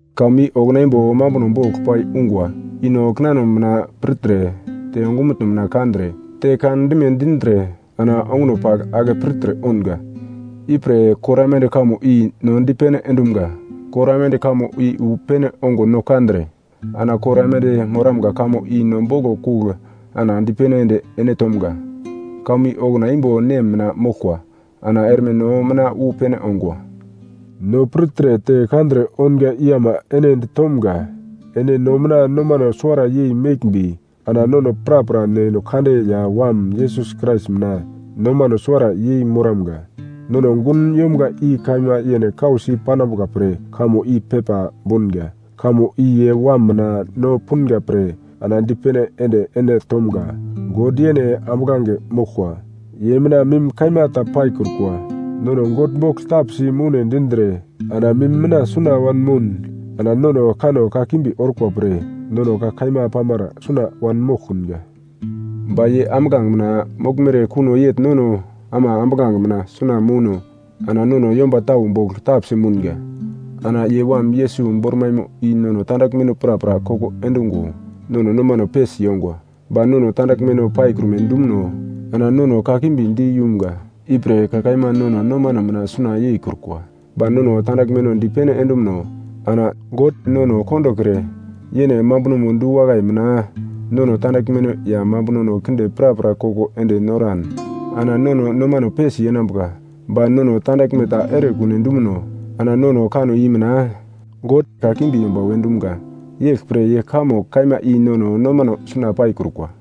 Kamo i okuna imbo mambuno bogl pai ungwa, i no kinano mina pirtre te ongumutno mina kandre te kandime dindre ana onguno pagl ake pirtre ounga. Ipre kor aimande kamo i no dipene endumga. Kor aimande kamo i wu pene ongo no kandre ana kor aimande moramga kamo i no boglo kugl ana dipene ende ene tomga. Kamo i okuna imbo Nem mina moglkwa ana erme no mina wu pene ongwa. No pirtre te kandre ounga i ama ene ditomga, ene no mina nomano suwara yei meglmbi ana nono prapra Neno Kande ya Wam Yesus Krais mina nomano suwara yei moramga. Nono gun yomga i kaima yene kausi panambuka pre kamo i pepa bounga. Kamo i ye Wam mina no punga pre ana dipene ende ene tomga. God, yene ambuglange moglkwa, ye mina mim kaima ta paikrukwa. Nono God bogl tapsi moune dindre ana mim mina suna wanmoun, ana nono kanno kakimbi orkwa pre nono ka kaima pamara suna wanmoglkunga. Ba ye ambuglange mina moglmere kuno yegl nono ama ambuglange mina suna mouno ana nono yomba tau bogl tapsi mounga, ana ye Wam Yesus bormaimo i nono tandaglmeno prapra koko endungo nono nomano pesi yongwa. Ba nono tandaglmeno paikrume dumuno, ana no nono kakimbi di yumga, ipre ka kaima nono nomano mina suna yeikrukwa. Ba nono tandaglmeno dipene endumuno, ana God nono kondokre yene mambunomo du-wakai mina nono tandaglmeno ya mambunono kinde prapra koko ende noran ana nono nomano pesi yenambuka. Ba nono tandaglme ta erekune dumuno ana nono kanno i mina, God kakimbi yomba we dumga. Yeglpre ye kamo kaima i nono nomano suna paikrukwa.